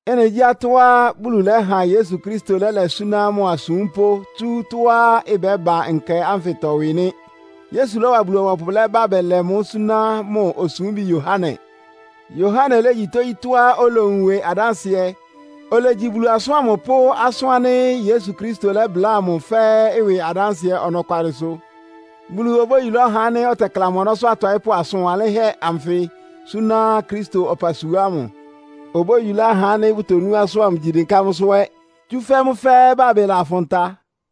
Ɩ́nɩ gyí atɔ́á Bulu lɛ́ha Yesu Kristo lɛ́lɛ súná mʋ asúmpʋ́ tsú tɔ́á ɩbɛ́ba nkɛ ánfɩtɔ ɩwɩ nɩ́. Yesu lɔ́wa Bulu-ɔbɔpʋ lɛ́ba bɛlɛ mʋ́ súná mʋ osúmbi Yohane. Yohane légyí tógyítɔ́á olowun ɩwɩ adánsɩɛ. Olegyi Bulu asʋ́n ámʋ pʋ́ asʋ́n ánɩ́ Yesu Kristo lɛ́bláa mʋ fɛ́ɛ́ ɩwɩ adánsɩɛ ɔnɔkwalɩsʋ. Bulu obóyulá ɔhá ánɩ́ ɔtɛkla mʋ ɔnɔ́sʋ́ ɔtɔɩ́pʋ́ asʋn wanlɩ́nhɛ́ anfɩ súná Kristo ɔpasua ámʋ. Obóyulá ahá ánɩ́ bʋtonú asʋ́n ámʋ, gyi dɩnká mʋ́sʋ́ ɛ́; tsúfɛ́ mʋ́ fɛ́ɛ́ bábɩ lafʋn ta.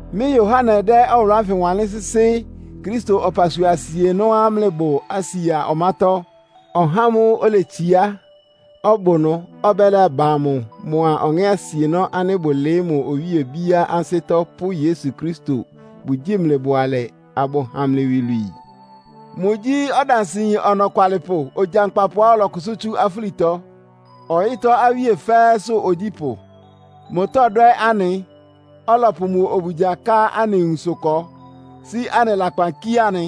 Mɩ́ Yohane dɛ́ ɔwʋlʋ́ ánfɩ wanlɩ́n sɩ́sɩ́ Kristo ɔpasua asienɔ́á mlɩbʋ Asia ɔmátɔ́. Ɔhá ámʋ́ʋ́ oletsiá, ɔbʋ ɩnʋ, ɔbɛ́laba amʋ mʋa Ɔŋɛ́ asienɔ́ ánɩ́ bʋlɩɩ́ mʋ owíe obíá ansɩ́tɔ́ pʋ́ Yesu Kristo bʋgyíi mlɩ bʋalɛ, abʋha mlɩ iwilwii. Mʋgyí ɔdansɩyin ɔnɔkwalɩpʋ, ogyankpapʋá ɔlɔkʋsʋ́ tsú afúlitɔ, ɔyɩ́tɔ́ awíe fɛ́ɛ́sʋ́ ogyípʋ́. Mʋtɔdwɛ́ anɩ, ɔlɔpʋ mʋ obugya ká anɩ nwunsʋ ɩkɔ, sí anɩ lakpan kíé anɩ.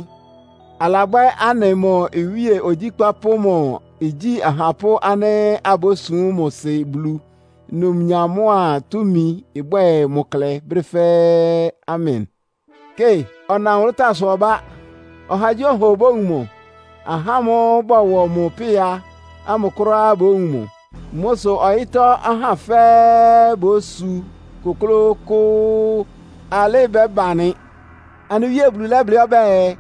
Alabwɛ́ anɩ mʋ iwíe ogyíkpá pʋ́ mʋ igyí ahapʋ́ ánɩ́ abósum mʋ Sɩ́ Bulu. Numnyam mʋ́a túmi ɩbwɛ́ɛ mʋ klɛ brɛ́ fɛ́ɛ́! Amen. Kɩ! Ɔna nwʋlʋ́táasʋ ɔbá! Ɔhagyíɔha obówun mʋ. Ahá ámʋ́ʋ́ bɔwɔ mʋ pɩ́a amʋ kʋ́ráá bówun mʋ. Mʋ sʋ ɔyɩ́tɔ́ ahá fɛ́ɛ́ bósu kʋ́klʋ́kʋ́ʋ́. Alɩ́ ɩbɛ́ba nɩ! Anɩ Wíe Bulu lɛ́blɩ́ ɔbɛ́ɛ,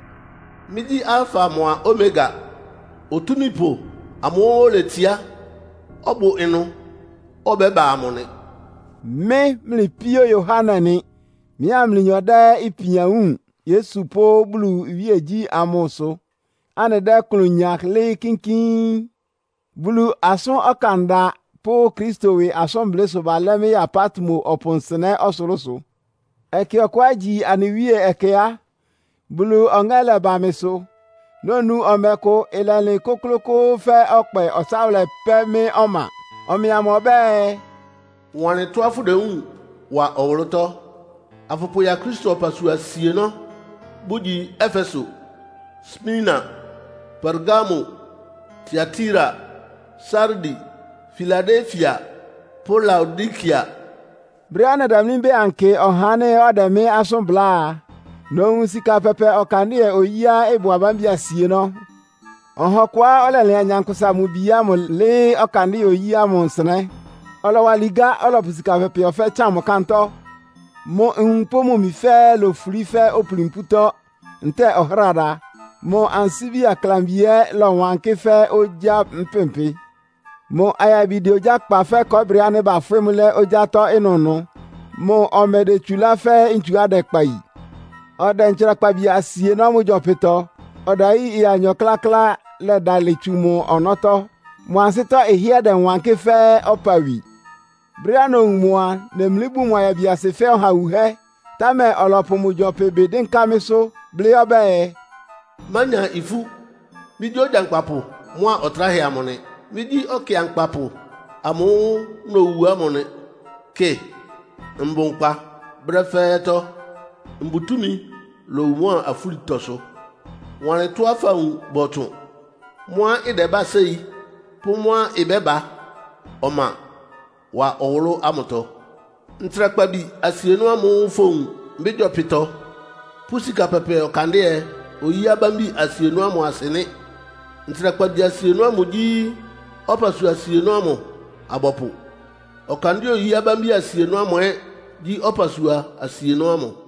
“Mɩ́gyí Alfa mʋ́a Omega. Otúmípʋ amʋ́ʋ́ oletsiá, ɔbʋ ɩnʋ, ɔbɛ́ba amʋ nɩ.” Mɩ́, mlɩ píó Yohane nɩ. Mɩ́a mlɩnyɔ dɛ́ ipian wúun Yesu pʋ́ Bulu iwíegyí ámʋ sʋ, anɩdɛ́ ɩklʋn nya lɩ́ɩ́ kínkín. Bulu asʋ́n ɔkanda pʋ́ Kristo ɩwɩ asʋ́nblɩ́ sʋ balɛ́ mɩ́ ya Patmo ɔpʋ nsɩnɛ́ ɔsʋlʋ́sʋ. Ɛkɛ ɔkʋá igyi anɩ Wíe ɛkɛ á, Bulu Ɔŋɛ́ lɛ́ba mɩsʋ. Nonu ɔmɛ kʋ, ɩlɛlɩn kʋ́klʋ́kʋ́ʋ́ fɛ́ ɔkpɛ ɔtsáwʋlɛ pɛ́ mɩ́ ɔma. Ɔmɛ amʋ ɔbɛ́ɛ, “Wanlɩn tɔ́á fʋdewúun wa ɔwʋlʋ́tɔ́, afʋpʋya Kristo ɔpasua asienɔ́, bʋgyi Efeso, Smirna, Pergamo, Tiatira, Sardi, Filadelfia pʋ́ Laodikea.” Brɛ́á nɛdamlí mbɛ́ɛ ankɩ ɔhá ánɩ́ ɔdɛ mɩ́ asʋ́n bláa a, nowun sika pɛpɛ ɔkandɩ́ɛ-oyíá ɩbʋ abámbi asienɔ́. Ɔha ɔkʋá ɔlɛlɩan Nyankpʋsa-Mʋ-Bi ámʋ lɩ́ɩ́ ɔkandɩ́ɛ-oyí ámʋ nsɩnɛ́. Ɔlɔwa ligá, ɔlɔpʋ sika pɛpɛ ɔfɛ́ tsan mʋ kántɔ́. Mʋ nwun pʋ́ mʋ imi fɛ́ɛ́ lofulí fɛ́ opuli mpútɔ́ ntɛ́ɛ ɔhráda. Mʋ ansíbi aklambi ɛ́ lɔwankɩ́ fɛ́ ogyá mpɩmpɩ. Mʋ ayabi dɛ ogyá kpa fɛ́ kɔɔ́brɩ ánɩ́ bafwɩ́ mʋ́ lɛ́ ogyátɔ́ ɩnʋnʋ. Mʋ ɔmɛ idetsulá fɛ́ ntsuá ɩdɛkpa yi. Ɔdɛ ntsrakpabi asienɔ́ mʋ gyɔpɩtɔ. Ɔdayí ɩya anyɔ kláklá lɛdalɩ tsu mʋ ɔnɔ́tɔ́. Mʋ ansɩ́tɔ́ ɩhɩ́ɛ́ dɛwankɩ́ fɛ́ ɔpawi. Brɛ́á nowun mʋ a, nemlí bun mʋ ayabiasɩ fɛ́ ɔha wuhɛ́, támɛ ɔlɔpʋ mʋ gyɔpɩ ɩbɩ dɩ́nká mɩ́sʋ́, blɩ́ ɔbɛ́ɛ, “Mánya ifú! Mɩ́gyí Ogyankpapʋ mʋ́a Ɔtráhɛ amʋ nɩ. Mɩ́gyí ɔkɩankpapʋ amʋ́ʋ́ nowu ámʋ nɩ. Kɩ, mbʋ nkpa brɛ́ fɛ́ɛ́tɔ́! Mbʋ túmi lowu mʋ́a afúlitɔsʋ. “Wanlɩn tɔ́á fawun bɔtsʋn, mʋ́á ɩdɛbá séi pʋ́ mʋ́á ɩbɛ́ba ɔma wa ɔwʋlʋ́ ámʋtɔ. Ntsrakpabi asienɔ́ ámʋ́ʋ́ fowun mɩ́ gyɔpɩtɔ pʋ́ sika pɛpɛ ɔkandɩ́ɛ-oyí abámbi asienɔ́ ámʋ asɩ nɩ́. Ntsrakpabi asienɔ́ ámʋ igyi ɔpasua asienɔ́ ámʋ abɔpʋ. Ɔkandɩ́ɛ-oyí abámbi asienɔ́ ámʋ ɛ́ gyí ɔpasua asienɔ́ ámʋ.